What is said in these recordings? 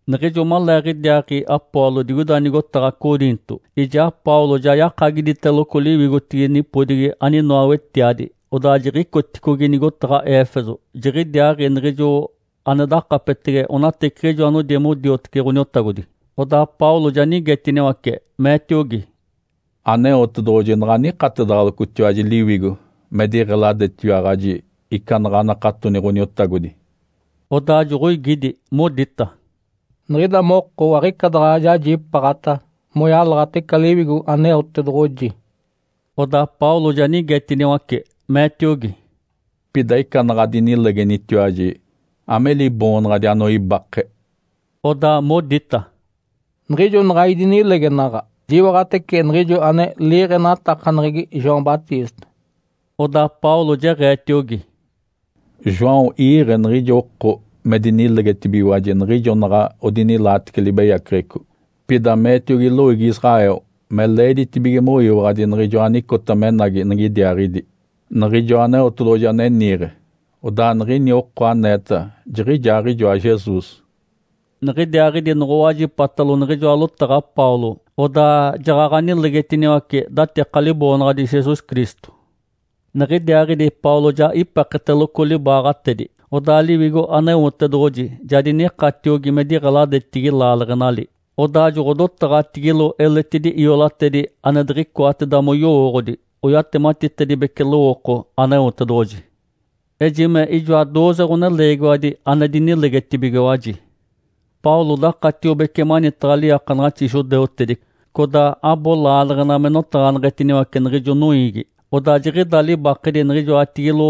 Niɡ̶ijo maleeɡ̶idiaaɡ̶i Apolo digoida nigotaɡ̶a Coriinto, ijaa Paulo ja yakagiditeloco liwigotigi nipodigi aninoa wetiadi, odaa jiɡ̶icoticogi nigotaɡ̶a Éfeso. Jiɡ̶idiaaɡ̶i niɡ̶ijo ane dakapetege onateciɡ̶ijo anodi modiotece Ǥoniotagodi. Odaa Paulo ja nigetiniwace, meetiogi, “Aneotedoɡ̶oji naɡ̶a nikatedaɡ̶alocotiwaji Liwigo me diɡ̶eladetiwaɡ̶aji ica naɡ̶a anakatoni Ǥoniotagodi?” Odaa joɡ̶oigidi, modita, “Niɡ̶ida moko aɡ̶ica daɡ̶a jajipaaɡ̶ata moyalaɡ̶ata ica Liwigo Aneotedoɡ̶oji.” Odaa Paulo ja nigetaciniwace, meetiogi, “Pida ica naɡ̶a adinilegenitiwaji, ame liboonaɡ̶adi anoibake?” Odaa modita, “Niɡ̶ijo naɡ̶a idinilegenaɡ̶a, jiwaɡ̶atece niɡ̶ijo ane liiɡ̶enatakaneɡ̶egi João Batista.” Odaa Paulo jeɡ̶eetiogi, “João iiɡ̶e niɡ̶ijo oko me dinilegetibigiwaji niɡ̶ijo naɡ̶a odinilaatece libeyaceɡ̶eco. Pida meetiogi loiigi Israel me leeditibige moyiwaɡ̶adi Niɡ̶ijoa anicota menagi nigidiaaɡ̶idi, Niɡ̶ijoa Aneotedoɡ̶oji ane niiɡ̶e. Odaa niɡ̶ini oko aneeta jiɡ̶ijaaɡ̶ijoa Jesus.” Niɡ̶idiaaɡ̶idi noɡ̶owajipatalo niɡ̶ijoa lotaɡ̶a Paulo, odaa jaɡ̶aɡ̶a nilegetiniwace datika Liboonaɡ̶adi Jesus Cristo. Niɡ̶idiaaɡ̶idi Paulo ja ipeketeloco libaaɡ̶atedi, odaa Liwigo Aneotedoɡ̶oji ja dinikatiogi me diɡ̶eladetigi laaleɡ̶enali. Odaa joɡ̶odotaɡ̶atigilo eletidi iolatedi ane diɡ̶icoateda moyowooɡ̶odi, oyatematitedibece lowooko Aneotedoɡ̶oji. Ejime ijoa dooze ɡ̶oneleegiwadi ane dinilegetibigiwaji. Paulo dakatiobece manitaɡ̶a liiakanaɡ̶axi judeutedi codaa abo laaleɡ̶ena me notaɡ̶aneɡ̶etiniwace niɡ̶ijo noiigi. Odaa jiɡ̶ida libakedi niɡ̶ijoatigilo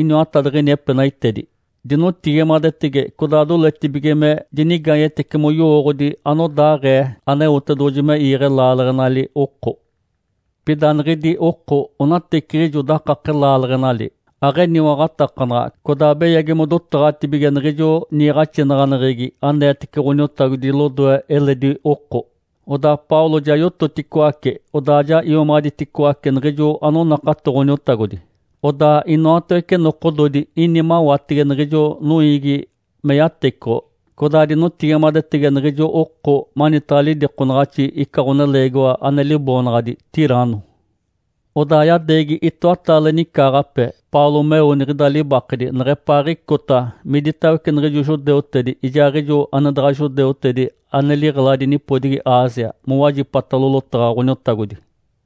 iniwatadiɡ̶ini epenaitedi. Dinotigimadetege codaa doletibige me dinigaanyetece moyowooɡ̶odi anodaaɡ̶ee Aneotedoɡ̶oji me iiɡ̶e laaleɡ̶enali oko. Pida niɡ̶idi oko onateciɡ̶ijo dakake laaleɡ̶enali, aɡ̶eniwaɡ̶atakanaɡ̶a, codaa beyagi modotaɡ̶atibige niɡ̶ijo niiɡ̶axinaɡ̶aneɡ̶egi aneetece Ǥoniotagodi lodoe eledi oko. Odaa Paulo ja yototicoace, odaa ja iomaɡ̶aditicoace niɡ̶ijo anonakato Ǥoniotagodi. Odaa inoatawece nokododi ini mawatege niɡ̶ijo noiigi me yatecoɡ̶o, codaa dinotigimadetege niɡ̶ijo oko manitaɡ̶a lidikonaɡ̶axi ica ɡ̶oneleegiwa ane liboonaɡ̶adi Tirano. Odaa yadeegi itoataale nicaaɡ̶ape Paulo meo niɡ̶ida libakedi neɡ̶epaaɡ̶icota miditawece niɡ̶ijo judeutedi ijaaɡ̶ijo ane daɡ̶a judeutedi ane liɡ̶eladi nipodigi Ásia mowajipatalo lotaɡ̶a Ǥoniotagodi.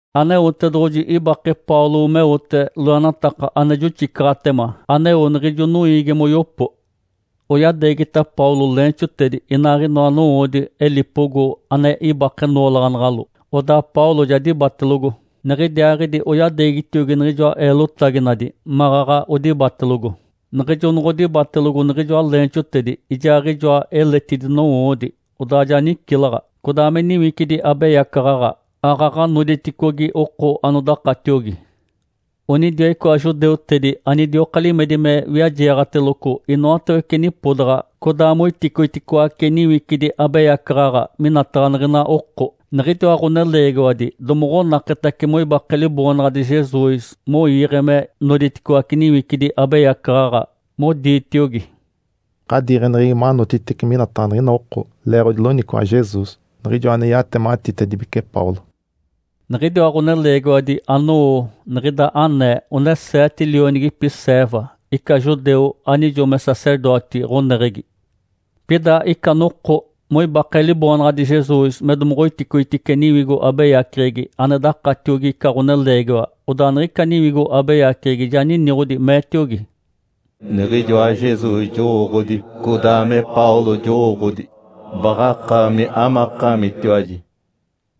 Aneotedoɡ̶oji ibake Paulo meote loenataka ane joxicaɡ̶atema aneo niɡ̶ijo noiigi moyopo. Oyadeegita Paulo leenxotedi inaaɡ̶inoa nowoodi elipogo ane ibake noolaɡ̶anaɡ̶alo, odaa Paulo ja dibatelogo. Niɡ̶idiaaɡ̶idi oyadeegitiogi niɡ̶ijoa eelotaginadi maɡ̶aɡ̶a odibatelogo. Niɡ̶ijo noɡ̶odibatelogo niɡ̶ijoa leenxotedi ijaaɡ̶ijoa eletidi nowoodi, odaa ja nicilaɡ̶a, codaa me niwicidi abeyacaɡ̶aɡ̶a aaɡ̶aɡ̶a noditicogi oko anodakatiogi. Onidiwa icoa judeutedi anidioka limedi me wiajeeɡ̶ateloco inoatawece nipodaɡ̶a codaa moiticoiticoace niwicidi abeyacaɡ̶aɡ̶a minataɡ̶a niɡ̶ina oko. Niɡ̶idiwa ɡ̶oneleegiwadi domoɡ̶onaketace moibake Liboonaɡ̶adi Jesus moiiɡ̶e me noditicoaci niwicidi abeyacaɡ̶aɡ̶a, moditiogi, “Ǥadiiɡ̶eneɡ̶egi manotitice minataɡ̶a niɡ̶ina oko leeɡ̶odi loniciwaɡ̶a Jesus, Niɡ̶ijoa ane yatematitedibece Paulo!” Niɡ̶idiwa ɡ̶oneleegiwadi anowo niɡ̶ida anee one seete lionigipi Ceva, ica judeu anijo me sacerdoti ɡ̶oneɡ̶egi. Pida ica noko moibake Liboonaɡ̶adi Jesus me domoɡ̶oiticoitice niwigo abeyaceɡ̶egi ane dakatiogi ica ɡ̶oneleegiwa, odaa niɡ̶ica niwigo abeyaceɡ̶egi ja niniɡ̶odi, meetiogi, “Niɡ̶ijoa Jesus jowooɡ̶odi, codaa me Paulo jowooɡ̶odi. Baɡ̶akaami, amakaamitiwaji?”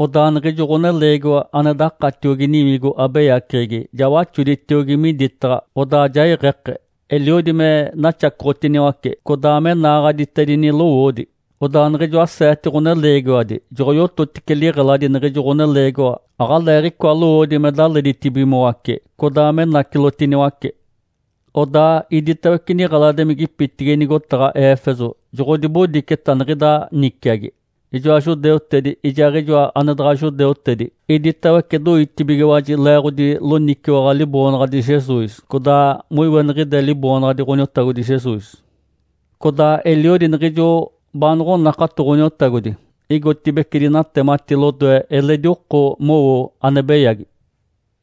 Odaa niɡ̶ijo ɡ̶oneleegiwa ane dakatiogi niwigo abeyaceɡ̶egi ja waxoditiogi miditaɡ̶a, odaa ja iɡ̶eke, eliodi me naxacoɡ̶otiniwace, codaa me naaɡ̶aditedini lowoodi. Odaa niɡ̶ijoa seete ɡ̶oneleegiwadi joɡ̶oyototice liɡ̶eladi niɡ̶ijo ɡ̶oneleegiwa aɡ̶aleeɡ̶icoa lowoodi me daleditibigimoace, codaa menacilotiniwace. Odaa iditawece niɡ̶eladimigipitigi nigotaɡ̶a Éfeso joɡ̶odibodiceta niɡ̶ida niciagi, ijoa judeutedi ijaaɡ̶ijo ane daɡ̶a judeutedi. Iditawece doitibigiwaji leeɡ̶odi loniciwaɡ̶a Liboonaɡ̶adi Jesus, codaa moiweniɡ̶ide Liboonaɡ̶adi Ǥoniotagodi Jesus. Codaa eliodi niɡ̶ijo baanoɡ̶onakato Ǥoniotagodi igotibeci dinatemati lodoe eledi oko mowo ane beyagi.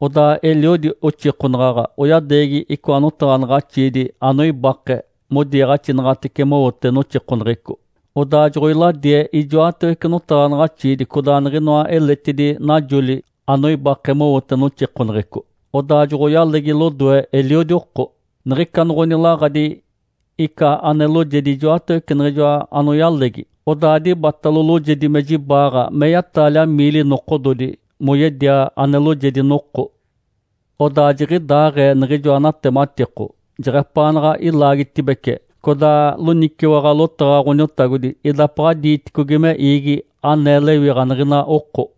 Odaa eliodi oxikonaɡ̶aɡ̶a oyadeegi icoa notaɡ̶anaɡ̶axiidi anoibake modiniiɡ̶axitece mowote noxikoneɡ̶eco. Odaa joɡ̶oiladie ijoatawece notaɡ̶anaɡ̶axiidi codaa niɡ̶inoa eletidi najoli anoibake mowote noxikoneɡ̶eco, odaa joɡ̶oyalegi lodoe eliodi oko. Niɡ̶ica noɡ̶onilaɡ̶adi ica ane loojedi ijoatawece niɡ̶ijoa anoyalegi, odaa dibatalo loojedi me jibaaɡ̶a meya-taalia miili nokododi moyedia ane loojedi noko. Odaa jiɡ̶idaaɡ̶ee niɡ̶ijoa natematiko jeɡ̶epaanaɡ̶a ilaagitibece, codaa loniciwaɡ̶a lotaɡ̶a Ǥoniotagodi idapaɡ̶a diiticogi me iigi anee lewiɡ̶a niɡ̶ina oko.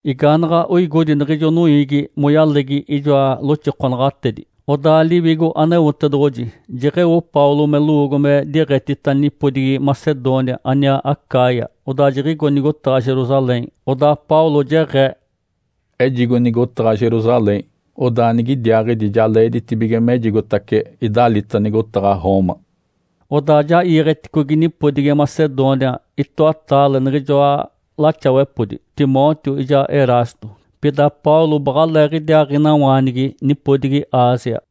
Igaanaɡ̶a oigodi niɡ̶ijo noiigi moyalegi ijoa loxikonaɡ̶atedi, odaa Liwigo Aneotedoɡ̶oji jeɡ̶eo Paulo me lowoogo me diɡ̶etita nipodigi Macedônia aniaa Acaia, odaa jiɡ̶igo nigotaɡ̶a Jerusalém. Odaa Paulo jeɡ̶ee, “Ejigo nigotaɡ̶a Jerusalém, odaa nigidiaaɡ̶idi ja leeditibige mejigotace idalita nigotaɡ̶a Roma.” Odaa ja iiɡ̶eticogi nipodigi Macedônia itoataale niɡ̶ijoa laxawepodi, Timóteo ijaa Erasto. Pida Paulo baɡ̶aleeɡ̶idiaaɡ̶inawaanigi nipodigi Ásia.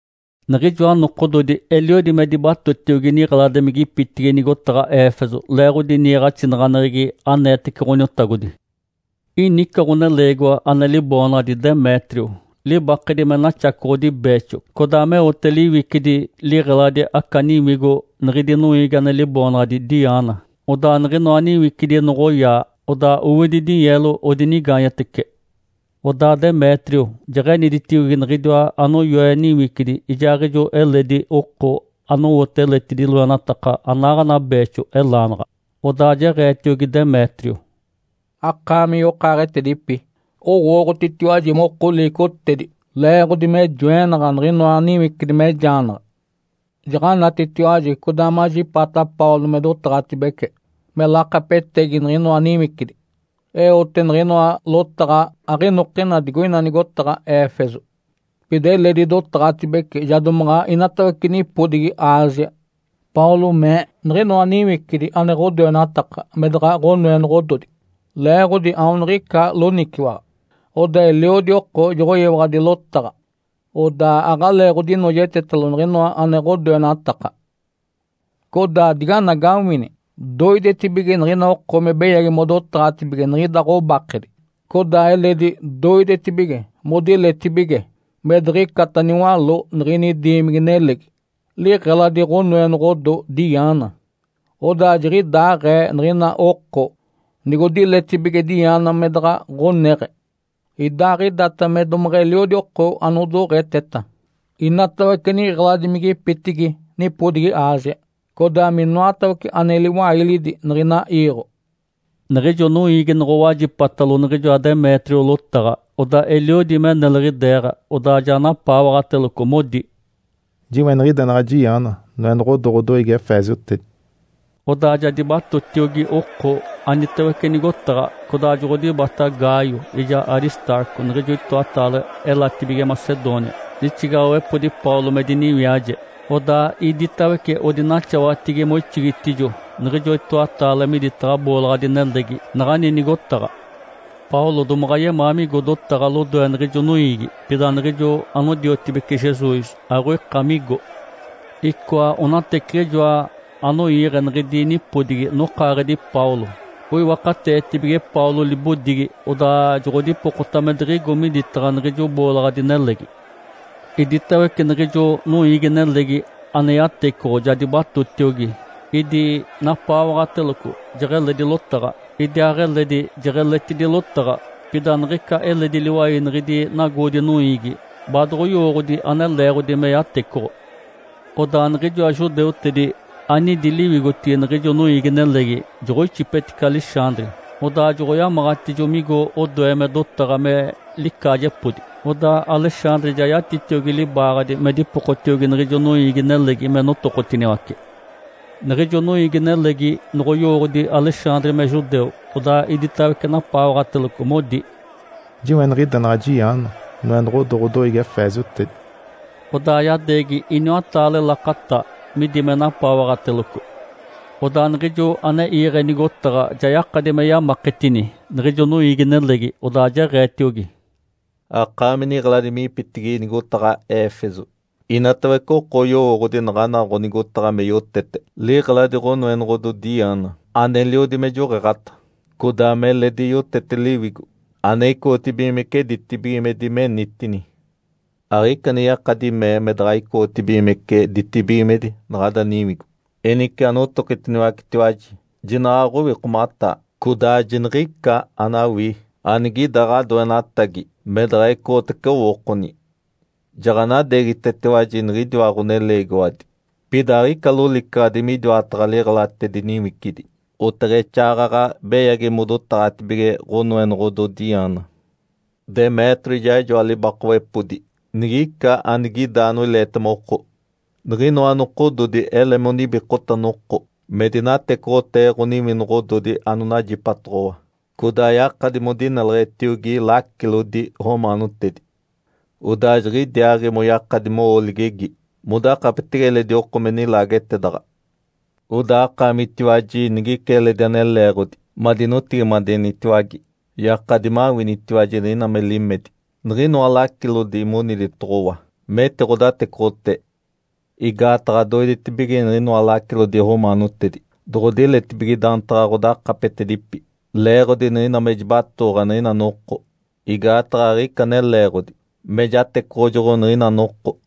Niɡ̶ijoa nokododi eliodi me dibatotiogi niɡ̶eladimigipitigi nigotaɡ̶a Éfeso leeɡ̶odi niiɡ̶axinaɡ̶aneɡ̶egi aneetece Ǥoniotagodi. Ini ica ɡ̶oneleegiwa ane liboonaɡ̶adi Demétrio, libakedi me naxacoɡ̶odi beexo codaa meote liwicidi liɡ̶eladi aca niwigo niɡ̶idi noiigi ane liboonaɡ̶adi Diana. Odaa niɡ̶inoa niwicidi noɡ̶oyaa, odaa owidi dinyeelo odinigaanyetece. Odaa Demétrio jeɡ̶eniditiogi niɡ̶idiwa anoyoe niwicidi ijaaɡ̶ijo eledi oko anowote eletidi loenataka anaaɡ̶ana beexo, elaanaɡ̶a. Odaa jeɡ̶eetiogi Demétrio, “Akaami yokaaɡ̶etedipi, owooɡ̶otitiwaji moko liicotedi leeɡ̶odi me joenaɡ̶a niɡ̶inoa niwicidi mejaanaɡ̶a. Jaɡ̶anatitiwaji codaa majipaata Paulo me dotaɡ̶atibece me lakapetegi niɡ̶inoa niwicidi. Eote niɡ̶inoa lotaɡ̶a aɡ̶inokina digoina nigotaɡ̶a Éfeso. Pida eledi dotaɡ̶atibece ja domaɡ̶a inatawece nipodigi Ásia. Paulo mee niɡ̶inoa niwicidi ane ɡ̶odoenataka me daɡ̶a ɡ̶onoenoɡ̶ododi leeɡ̶odi aoniɡ̶ica loniciwaɡ̶a. Odaa eliodi oko joɡ̶oyiwaɡ̶adi lotaɡ̶a, odaa aɡ̶aleeɡ̶odinoojetetalo niɡ̶inoa ane ɡ̶odoenataka. Codaa diganagawini, doidetibige niɡ̶ina oko me beyagi modotaɡ̶atibige niɡ̶ida ɡ̶obakedi, codaa eledi doidetibige modiletibige me diɡ̶icata niwaló niɡ̶ini diimigi-nelegi, liɡ̶eladi ɡ̶onoenoɡ̶odo Diana. Odaa jiɡ̶idaaɡ̶ee niɡ̶ina oko nigodiletibige Diana me daɡ̶a ɡ̶oneɡ̶e, idaaɡ̶idata me domeɡ̶eliodi oko anodoɡ̶eteta, inatawece niɡ̶eladimigipitigi nipodigi Ásia, codaa minoatawece ane liwailidi niɡ̶ina iiɡ̶o!” Niɡ̶ijo noiigi noɡ̶owajipatalo niɡ̶ijoa Demétrio lotaɡ̶a, odaa eliodi me neliɡ̶ideeɡ̶a, odaa ja napaawaɡ̶ateloco, modi, “Jiweniɡ̶idenaɡ̶a Diana, noenoɡ̶odo ɡ̶odoiigi efeesiotedi!” Odaa ja dibatotiogi oko anitawece nigotaɡ̶a. Codaa joɡ̶odibata Gaio ijaa Aristarco, niɡ̶ijo itoataale elatibige Macedônia, lixigaɡ̶awepodi Paulo me diniwiaje. Odaa iditawece odinaxawatigi moixigitijo niɡ̶ijo itoataale miditaɡ̶a boolaɡ̶adi-nelegi naɡ̶ani nigotaɡ̶a. Paulo domaɡ̶a yemaa migo dotaɡ̶a lodoe niɡ̶ijo noiigi, pida niɡ̶ijo anodiotibece Jesus aɡ̶oika migo. Icoa onateciɡ̶ijoa anoiiɡ̶e niɡ̶idi nipodigi nokaaɡ̶edi Paulo. Oiwakateetibige Paulo libodigi, odaa joɡ̶odipokota me diɡ̶igo miditaɡ̶a niɡ̶ijo boolaɡ̶adi-nelegi. Iditawece niɡ̶ijo noiigi-nelegi ane yatecoɡ̶o ja dibatotiogi. Idi napaawaɡ̶ateloco jeɡ̶eledi lotaɡ̶a, idiaaɡ̶eledi jeɡ̶eletidi lotaɡ̶a, pida niɡ̶ica eledi liwai niɡ̶idi nagoodi-noiigi baadoɡ̶oyowooɡ̶odi ane leeɡ̶odi me yatecoɡ̶o. Odaa niɡ̶ijoa judeutedi anidi liwigotigi niɡ̶ijo noiigi-nelegi joɡ̶oixipetice Alexandre, odaa joɡ̶oyamaɡ̶atijo migo odoe me dotaɡ̶a me licaajepodi. Odaa Alexandre ja yatitiogi libaaɡ̶adi me dipokotiogi niɡ̶ijo noiigi-nelegi me notokotiniwace. Niɡ̶ijo noiigi-nelegi noɡ̶oyowooɡ̶odi Alexandre me judeu, odaa iditawece napaawaɡ̶ateloco, modi, “Jiweniɡ̶idenaɡ̶a Diana, noenoɡ̶odo ɡ̶odoiigi efeesiotedi!” Odaa yadeegi iniwataale lakata midi me napaawaɡ̶ateloco. Odaa niɡ̶ijo ane iiɡ̶e nigotaɡ̶a ja yakadi me yamaketini niɡ̶ijo noiigi-nelegi, odaa jeɡ̶eetiogi, “Akaami niɡ̶eladimigipitigi nigotaɡ̶a Éfeso, inatawece oko oyowooɡ̶odi naɡ̶ana ɡ̶onigotaɡ̶a me yotete liɡ̶eladi ɡ̶onoenoɡ̶odo Diana aneliodi me joɡ̶eeɡ̶ata, codaa meledi yotete liwigo ane icoɡ̶otibigimece ditibigimedi menitini. Aɡ̶ica ane yakadi mee me daɡ̶a icoɡ̶otibigimece ditibigimedi naɡ̶ada niwigo. Enice anotokitiniwacitiwaji, jinaɡ̶a aɡ̶owikomataa, codaa jiniɡ̶ica anawii anigida ɡ̶adoenatagi me daɡ̶a ecoɡ̶otace owookoni. Jaɡ̶anadeegitetiwaji niɡ̶idiwa ɡ̶oneleegiwadi, pida aɡ̶ica lolicaɡ̶adi midiwataɡ̶a liɡ̶elatedi niwicidi, oteɡ̶exaaɡ̶aɡ̶a beyagi modotaɡ̶atibige ɡ̶onoenoɡ̶odo Diana. Demétrio ijaaɡ̶ijoa libakawepodi nigica anigida anoileetema oko, niɡ̶inoa nokododi ele monibikota noko me dinatecoɡ̶otee ɡ̶oniwinoɡ̶ododi anonajipatoɡ̶owa, codaa yakadi modineleɡ̶etiogi lacilodi romaanotedi. Odaa jiɡ̶idiaaɡ̶i moyakadi mowo ligegi modakapetege eledi oko me nilaagetedaɡ̶a. Odaa akaamitiwaji nigica eledi ane leeɡ̶odi madinotigimadenitiwage, yakadi mawinitiwaji niɡ̶ina me limedi niɡ̶inoa lacilodi moniditoɡ̶owa metiɡ̶odatecoɡ̶otee. Igaataɡ̶a doidetibige niɡ̶inoa lacilodi romaanotedi doɡ̶odiletibige daantaɡ̶a ɡ̶odakapetedipi leeɡ̶odi niɡ̶ina me jibatooɡ̶a niɡ̶ina noko. Igaataɡ̶a aɡ̶ica ane leeɡ̶odi me jatecoɡ̶ojoɡ̶o niɡ̶ina noko.”